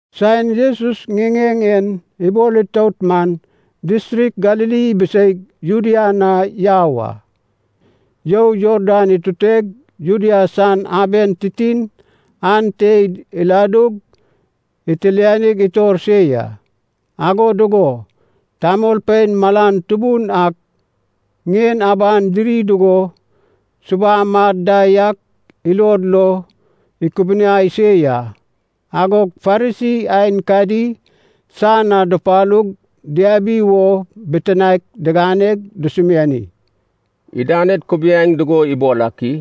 Saen Jesus ŋiŋeŋ en ibol itout man, distrik Galili ibiseig Judea na yau a. You Jordan ituteg Judea san aben titin ante iladug itilianig itor se ya. Ago dugo tamolpein malan tubun ak ŋien aban diri dugo subam ad da yak ilod lo ikubuniai se ya. Agog Farisi aenkadi san na dupalug diabi wo bitinaek diganeg dusumiani, “Idaned kubiaeŋ dugo ibol ak i?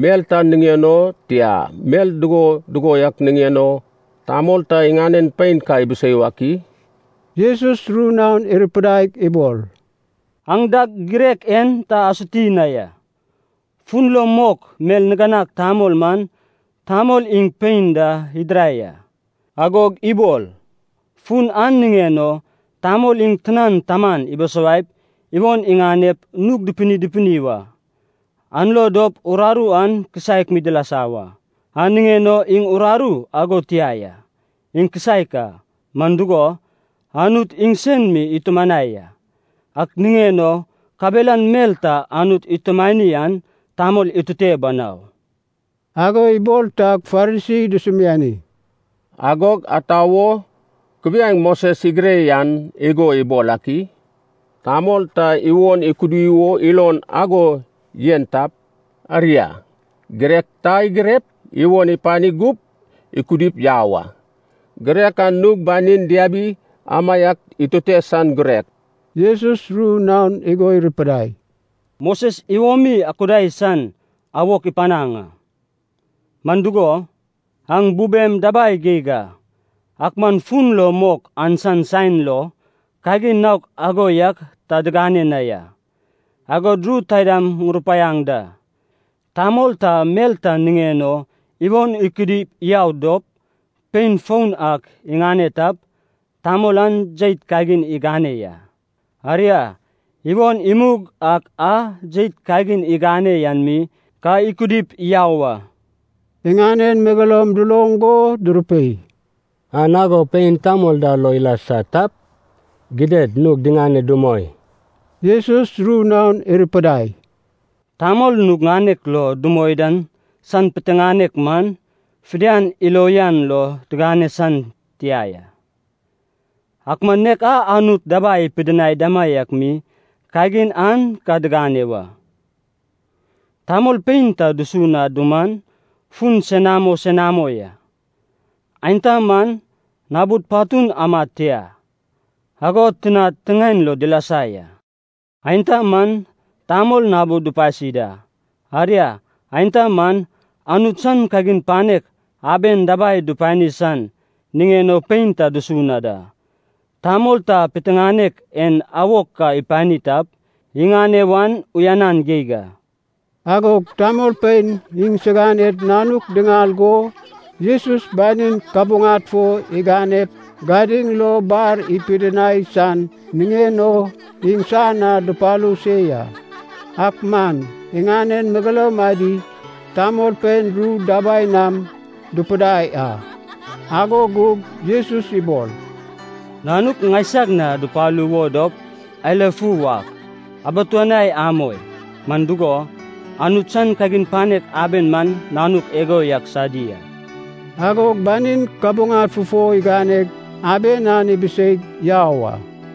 Mel ta niŋen o, tia, mel dugo dugo yak niŋen o, tamol ta iŋanen pein ka ibisei wak i?” Jesus ru naon irupidaig ibol, “Aŋ dag girek en ta asuti na ya, ‘Fun lo mok Mel Niganag Tamol man tamol iŋ pein da idirai a,’ agog ibol, ‘Fun an niŋen o tamol iŋ tinan taman ibisawaip iwon iŋanep nug dupini dupini wa, an lo dop uraru an kisaek mi dilasa wa.’ An niŋen o iŋ uraru ago tia ya, iŋ kisaek a, man dugo, Anut iŋsen mi itumanai a. Ak niŋen o kabelan mel ta Anut itumanai an tamol itute banau.” Ago ibol tag Farisi dusumiani, “Agog ata wo kubiaeŋ Moses igire yan igo ibol ak i? Tamol ta iwon ikudi wo ilon ago yen tap, aria, girek ta igirep, iwon ipani gup ikudip yau a. Girek an nug banin diabi amaiak itute san girek.” Jesus ru naon igo irupidai, “Moses iwomi akudai san awok ipanaŋ a, man dugo, aŋ bubem dabai geig a. Ak man fun lo mok an san saen lo, kagin naok ago yak ta digane na ya. Agod ru taida ŋurupaiaŋ da, tamol ta mel ta niŋen o iwon ikudi yau dop, pein foun ak iŋane tap, tamol an jeit kagin igane ya. Aria, iwon imug ak a jeit kagin igane yan mi ka ikudip yau a.” Iŋanen megeloum duloŋ go durupei, “An ago pein tamol da lo ilasa tap, gidad nug diŋane dumoi.” Jesus ru naon irupidai, “Tamol nug ŋanek lo dumoi dan san piteŋanek man, fidian ilo uyan lo diŋane san tia ya, ak man nek a Anut dabai ipidinai damaiak mi kagin an ka diŋane wa. Tamol pein ta dusu na duman, fun senamo senamo ya. Aenta man nabud patun amad tia, ago tinad tiŋaen lo dilasa ya. Aenta man tamol nabud dupasi da. Aria, aenta man, Anut san kagin panek aben dabai dupani san niŋen o pein ta dusu na da. Tamol ta piteŋanek en awok ka ipani tap, iŋane wan uyanan geig a.” Agog tamolpein iŋsiganed nanuk diŋal go Jesus banin kabuŋad fo iganep gadiŋ lo bar ipidinai san niŋen o iŋsan na dupalu se ya. Ak man iŋanen megeloum adi tamolpein ru dabai nam dupudai a. Ago gug Jesus ibol, “Nanuk ŋaisag na dupalu wo dop eilafu wak, abituanai amoi. Man dugo, Anut san kagin panek aben man nanuk igo yak sadi a.” Agog banin kabuŋad fufo iganeg aben an ibiseig yau a.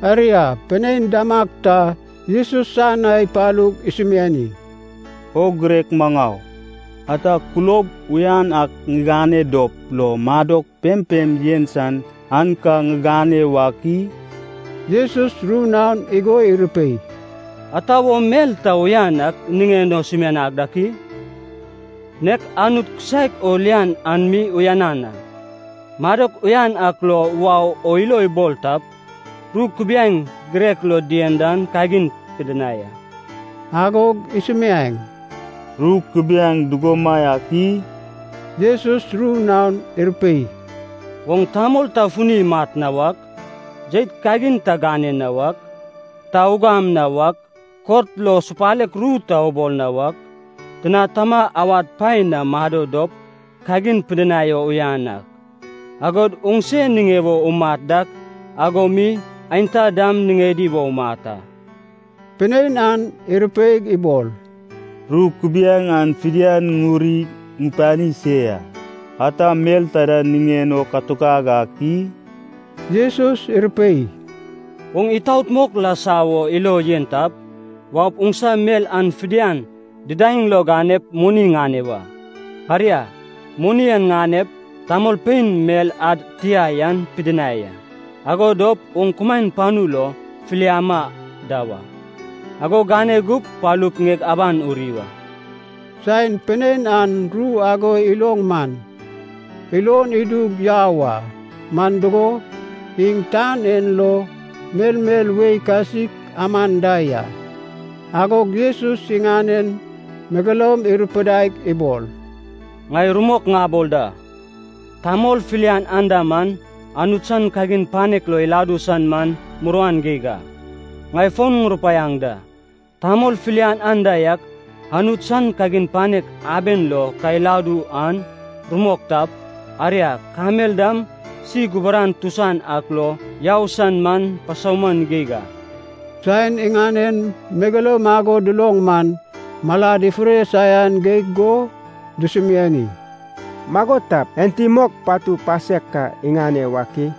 Aria, pinein damag ta Jesus san na ipalug isumiani, “O girek maŋau, ata kulob uyan ak ŋigane dop lo madok pempem yen san an ka ŋiŋane wak i?” Jesus ru naon igo irupei, “Ata wo mel ta uyan an niŋen o sumianag dak i? Nek Anut kisaek o lian an mi uyanan a. Madok uyan ak lo wau o ilo ibol tap, ru kubiaeŋ girek lo dien dan kagin pidinai a.” Agog isumiaeŋ, “Ru kubiaeŋ dugomaiak i?” Jesus ru naon irupei, “Oŋ tamol ta funi imat na wak, jeit kagin ta gane na wak, ta ugam na wak, kot lo supalek ru ta ubol na wak, tina tama awad paen na mado dop kagin pidinai o uyan ak, agod oŋse niŋe wo umat dak ago mi aenta dam niŋedi wo umat a.” Pinein an irupeig ibol, “Ru kubiaeŋ an fidian ŋuri ŋupani se ya. Ata mel taida niŋen o katuk ag ak i?” Jesus irupei, “Oŋ itaot mok lasa wo ilo yen tap, waup oŋsa mel an fidian didaeŋ lo ganep moni ŋane wa. Aria, moni an ŋanep tamolpein mel ad tia yan pidinai a. Ago dop oŋ kumaen panu lo filiama da wa. Ago gane gup palup ŋieg aban uri wa.” Saen pinein an ru ago iloŋ man, ilon idug yau a, man dugo, iŋ tan en lo melmel wei kasik aman da ya. Agog Jesus iŋanen megeloum irupidaig ibol, “Ŋai rumok ŋabol da, tamol filian anda man Anut san kagin panek lo iladu san man muruan geig a. Ŋai fon ŋurupaiaŋ da, tamol filian anda yak Anut san kagin panek aben lo ka iladu an, rumok tap, aria, kamel dam si guburan tusan ak lo yau san man pasauman geig a.” Saen iŋanen megeloum ago duloŋ man, malad ifure saian geig go dusumiani, “Mago tap, enti mok patu pasek ka iŋane wak i?”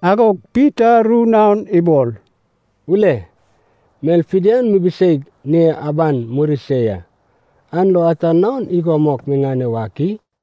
Agog Pita ru naon ibol, “Ule, mel fidian mibiseig ŋie aban muri se ya, an lo ata naon igo mok miŋane wak i?”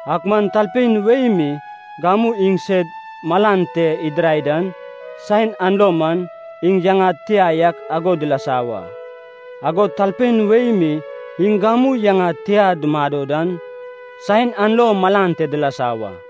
Ak man talpein wei mi gamu iŋ sed malan te idirai dan, saen an lo man iŋ yaŋad tia yak ago dilasa wa. Agod talpein wei mi iŋ gamu yaŋad tia dumado dan, saen an lo malan te dilasa wa.